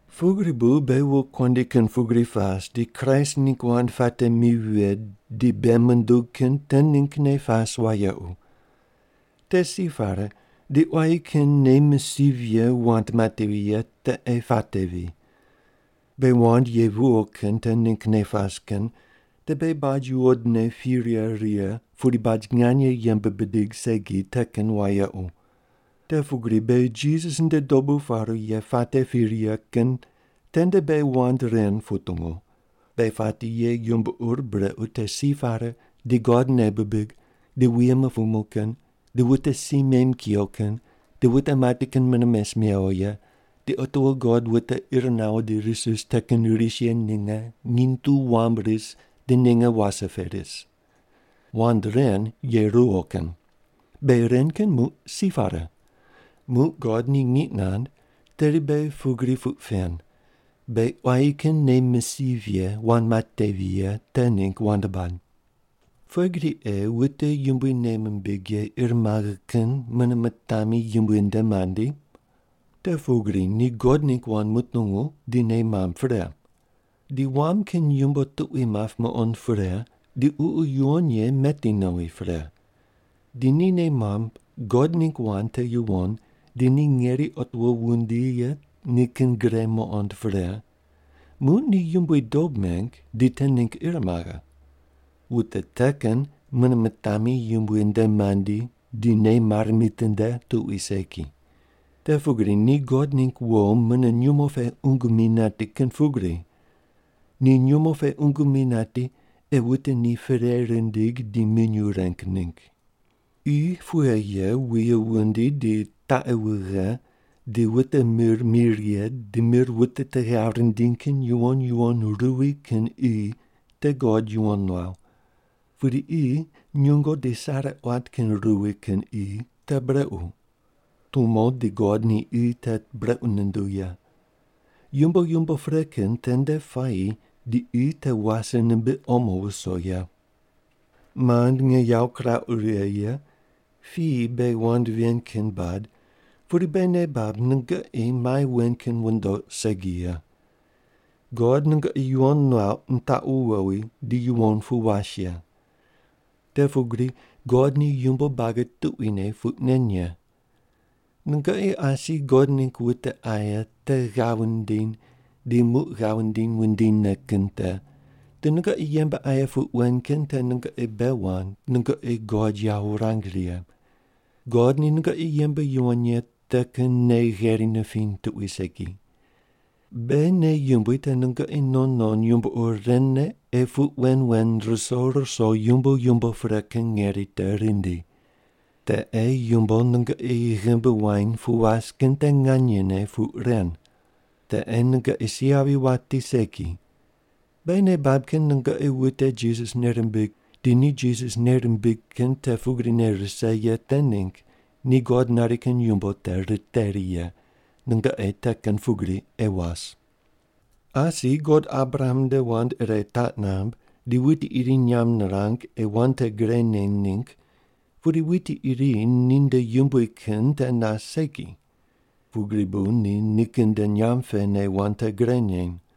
Pugri bu beghi wokuandi kin pugri pas di Kraist ningg wand puate mi vighe di bei mundug kin te ninggne pas wayequ. Te si pare di quayi kin nei misiv ye wand matevi ye te ei patevi. Beghi wand ye viwo kin te ninggne pas kin te beghi baj yuwodne pi righe righe pudi baj nganye yembe bidig segi te kin wayequ. Te pugri beghi Jisas nde dobu paru ye puate pi righe kin tende beghi wand ren putungu: Beghi pati ye yumbo ur brequ te si pare, di God nei bibig, di wuye mupumu kin, di wute si mem kuyo kin, di wute mati kin mune mes mewo ye, di otiwo God wute ir nawo di ris ris te kin ris ye ninge nginy tu wam ris di ninge wase pe ris. Wand ren ye ruwo kin. Beghi ren kin muq si pare. Muq God ni ngiq nand tedi beghi pugri puq pen, beghi quayi kin nei misiv ye wand matevi ye te ningg wand bad. Pughe gri ei wute Yumbui nei mimbig ye ir maghe kin mune mitami Yumbui nde mandi? Te pugri ni God ningg wand mutungu di nei mamb pre. Di wam kin yumbo tuqui map muqond pre, di Ququ Yuwon Ye meti nowi pre. Di ni nei mamb God ningg wand te yuwon, di ni ngeri otiwo wundi ye nikin gre muqond pre, muq ni Yumbui dob meng di te ningg ir maghe. Wute te kin mune mitami Yumbui nde mandi di nei mare mitinde tuqui segi. Te pugri ni God ningg wo mune nyumo pe qungu mi nati kin pugri. Ni nyumo pe qungu mi nati ei wute ni perei rindig di minyuw reng ningg. Qi pughe ye wuye wundi di taqi wughe di wute mir mi righe di mir wute te ghav rindiny kin yuwon yuwon ruwi kin qi te God yuwon nuaw. Pudi qi nyungo di sare quat kin ruwi kin qi te brequ. Tumo di God ni qi te brequ nunduw ye. Yumbo yumbo pre kin tende puayi di qi te wase nimbiq omo wuso ye. Mand nge yawo kirauq righe ye, piyi beghi wand ven kin bad pudi beghi nei bab nungoqi mai wen kin wundoq segi ye. God nungoqi yuwon nuauq nitaqu wowi di yuwon pu was ye. Te pugri God ni yumbo buagi tuquine puq nen ye. Nungoqi asi God ningg wute aye te ghav wundiny di muq ghav wundiny wundinyne kin te, di nungoqi yembe aye puq wen kin te nungoqi bei wand nungoqi God yawo wurang righe. God ni nungoqi yembe yuwon ye te kin nei gheri nipiny tuqui segi. Beghi nei yumbui te nungoqi non non yumbo ur ren ne ei puq wen wen ruso ruso yumbo yumbo pre kin ngeri te rindi. Te ei yumbo nungoqi ghimbi wany pu was kin te nganyene puq ren. Te ei nungoqi si yavi wati segi. Beghi nei bab kin nungoqi wute Jisas nei rimbig di ni Jisas nei rimbig kin te pugrine rise ye te ningg ni God nari kin yumbo te riteri ye, nungoqi te kin pugri ei was. Asi God Abraham nde wand ire taq namb di wuti iri nyamb nirang ei wand te gre neny ningg pudi wuti iri ninde yumbui kin te nas segi. Pugri bu ni nikin nde nyamb pene wand te gre neny.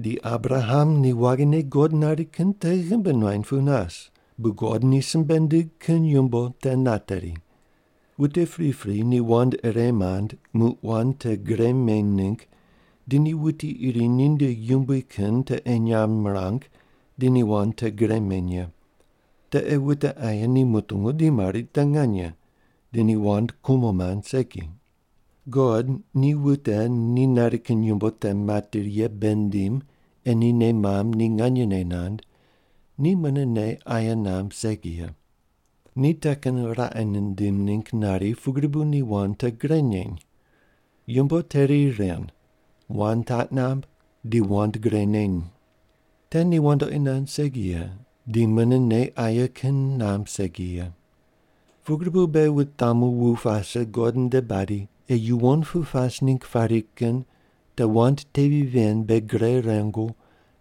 Di Abraham ni waghine God nari kin te ghimbi nuany pu nas, bu God ni simbe nindig kin yumbo te nateri. Wute pripri ni wand ire mand muq wand te gre meny ningg di ni wuti iri ni nde yumbui kin te ei nyamb mirang di ni wand te gre meny ye. Te ei wute aye ni mutungu di mari te nganye, di ni wand kumo mand segi. God ni wute ni nari kin yumbo te materi ye bei nindim ei ni nei mamb ni nganyene nand, ni mune nei aye namb segi ye. Ni te kin raqe nindim ningg nari pugri bu ni wand te gre neny. Yumbo teri ren: wand taq namb, di wand gre neny. Te ni wandoqi nand segi ye, di mune nei aye kin namb segi ye. Pugri bu beghi wutamu wu pase God nde badi ei yuwon pu pas ningg pari kin te wand tevi ven beghi gre rengu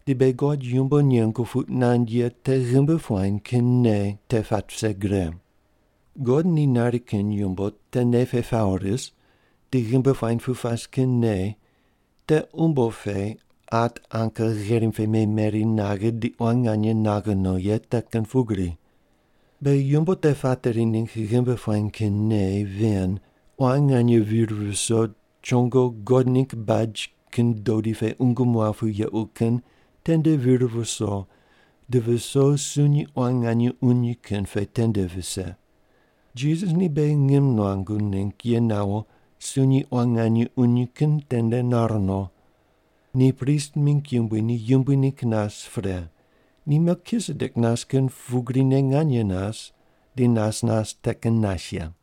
di beghi God yumbo nengu puq nand ye te ghimbi puany kin nei te pat vise gre. God ni nari kin yumbo te nei pe pawo ris di ghimbi puany pu pas kin nei te umbo pe at anka gherim pe memeri naghe di quan nganye naghe no ye te kin pugri. Beghi yumbo te pateri ningg ghimbi puany kin nei ven quan nganye vir viso chongo God ningg baj kin dodi pe qungu muaw pu yequ kin tende vir viso di viso sunyi quan nganye uny kin pe tende vise. Jisas ni beghi ngim nuangu ningg ye nawo sunyi quan nganye uny kin tende nar no. Ni prist mingg yumbui ni yumbui ningg nas pre, ni Melkisedek nas kin pugrine nganye nas di nas nas te kin nas ye.